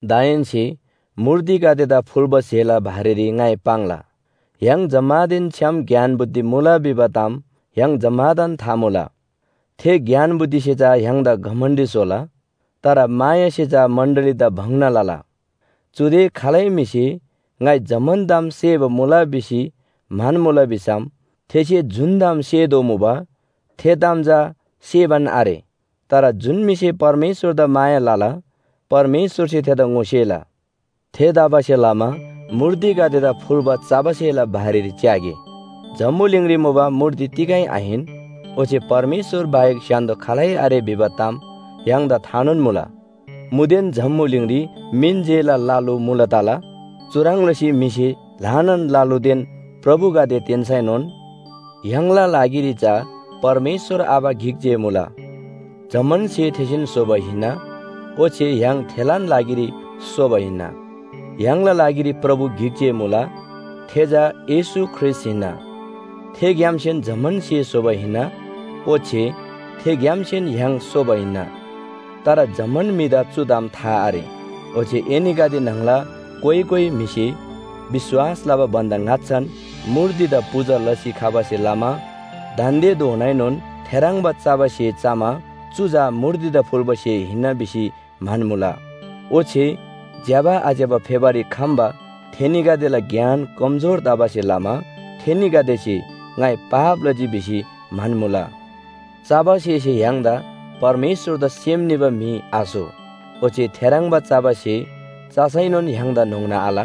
दाहेन्‍से मूर्तिगदेदा फुल्‍बा स्‍हेला बारेरी ङाइ पाङ्ला। य्‍हाङ जम्‍मानदेन छ्‌याम ज्ञान बुद्धि मुला भिबा ताम य्‍हाङ जम्‍मादान था मुला। थे ज्ञान बुद्धिसे चा य्‍हाङदा घमण्‍डी स्‍होला। तर मायासे चा मण्‍डलीदा भङ्‍ना लला। चुदे खालै म्‍हिसे “ङाइ जम्‍मान ताम सेबा मुला” भिसी म्‍हन्‍मुला भिसम थेसे जुन ताम सेतोःमुबा थे ताम चा सेबान आरे। तर जुन म्‍हिसे परमेश्‍वरदा माया लला परमेश्‍वरसे थेदा ङोसेला। थेतबासेलमा मूर्तिगदेदा फुल्‍बा चबा स्‍हेला बारेरी च्‍यागे। जम्‍बुलिङरी मुबा मूर्ति तिगै आहिन। ओच्‍छे परमेश्‍वर बाहेक स्‍य्‍हान्‍दो खालै आरे भिबा ताम य्‍हाङदा थानोन मुला। मुदेन जम्‍बुलिङरी मिन जेला ल लु मुला तला। चुह्रङ् लसी म्‍हिसे ल्‍हानान ल लुदेन प्रभुगदे तेन्‍सैनोन, य्‍हाङला लागिरी चा परमेश्‍वर आबा गिक जे मुला, जम्‍मान स्‍हे थेसेन स्‍होबा हिन्‍ना। ओच्‍छे य्‍हाङ थेलान लागिरी सोबा हिन्‍ना। य्‍हाङला लागिरी प्रभु गिक जे मुला थे चा येशू ख्रीष्‍ट हिन्‍ना। थेग्‍यामसेन जम्‍मान स्‍हे स्‍होबा हिन्‍ना। ओच्‍छे थेग्‍यामसेन य्‍हाङ सोबा मुला। तर जम्‍मान म्‍हिदा चु ताम था आरे। ओच्‍छे एनीगदे न्‍हङला कोइ कोइ म्‍हिसे विश्‍वास लबा भन्‍दा ङाच्‍छान मूर्तिदा पूजा लसी खबासे लमा दान्‍देधोनाएनोन थेह्रङ्बा चबा स्‍हे चमा चु चा मूर्तिदा फुल्‍बा स्‍हे हिन्‍ना भिसी म्‍हन्‍मुला। ओच्‍छे ज्‍यबा आज्‍यबा फेबारी खम्‍बा थेनीगदेला ज्ञान कमजोर तबासे लमा थेनीगदेसे “ङाइ पाप लजी” भिसी म्‍हन्‍मुला। चबा स्‍हेसे य्‍हाङदा परमेश्‍वरदा सेम निबा म्‍हि आस्‍हो। ओच्‍छे थेह्रङ्बा चबा स्‍हे चसैनोन य्‍हाङदा न्‍होङ्ना आल,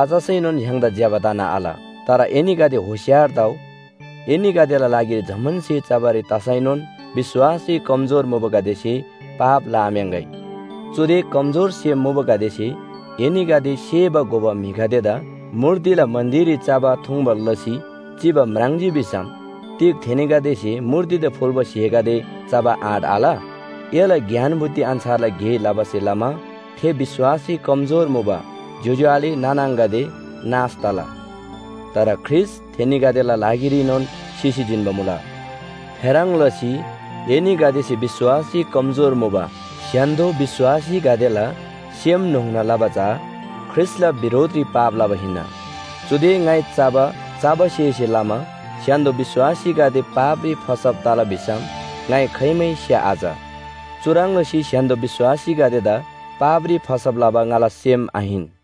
आचसैनोन य्‍हाङदा ज्‍यबा तना आल। तर एनीगदे होशियार तउ, एनीगदेला लागिरी जम्‍मान स्‍हे चबारी तसैनोन विश्‍वासरी कमजोर मुबागदेसे पाप लआम्‍याङ्‍गै। चुदे कमजोर सेम मुबागदेसे एनीगदे सेबा घोबा म्‍हिगदेदा मूर्तिला मन्‍दिररी चबा थुङ्बा लसी चिबा म्राङ्जी भिसम, तिग थेनीगदेसे मूर्तिदा फुल्‍बा स्‍हेगदे चबा आँट आल? एला ज्ञान बुद्धि अन्‍छारला गे लबासे लमा थे विश्‍वासरी कमजोर मुबा ज्‍योज्‍यो आले नाना आङागदे नाश तला। तर ख्रीष्‍ट थेनीगदेला लागिरीनोन सिसी जिन्‍बा मुला। थेह्रङ् लसी एनीगदेसे विश्‍वासरी कमजोर मुबा स्‍य्‍हान्‍दो विश्‍वासीगदेला सेम न्‍होङ्ना लबा चा ख्रीष्‍टला बिरोधरी पाप लबा हिन्‍ना। चुदे ङाइ चबा चबा स्‍हेसे लमा स्‍य्‍हान्‍दो विश्‍वासीगदे पापरी फसब तला भिसम ङाइ खाइमै स्‍या आच। चुह्रङ् लसी स्‍य्‍हान्‍दो विश्‍वासीगदेदा पापरी फसब लबा ङाला सेम आहिन।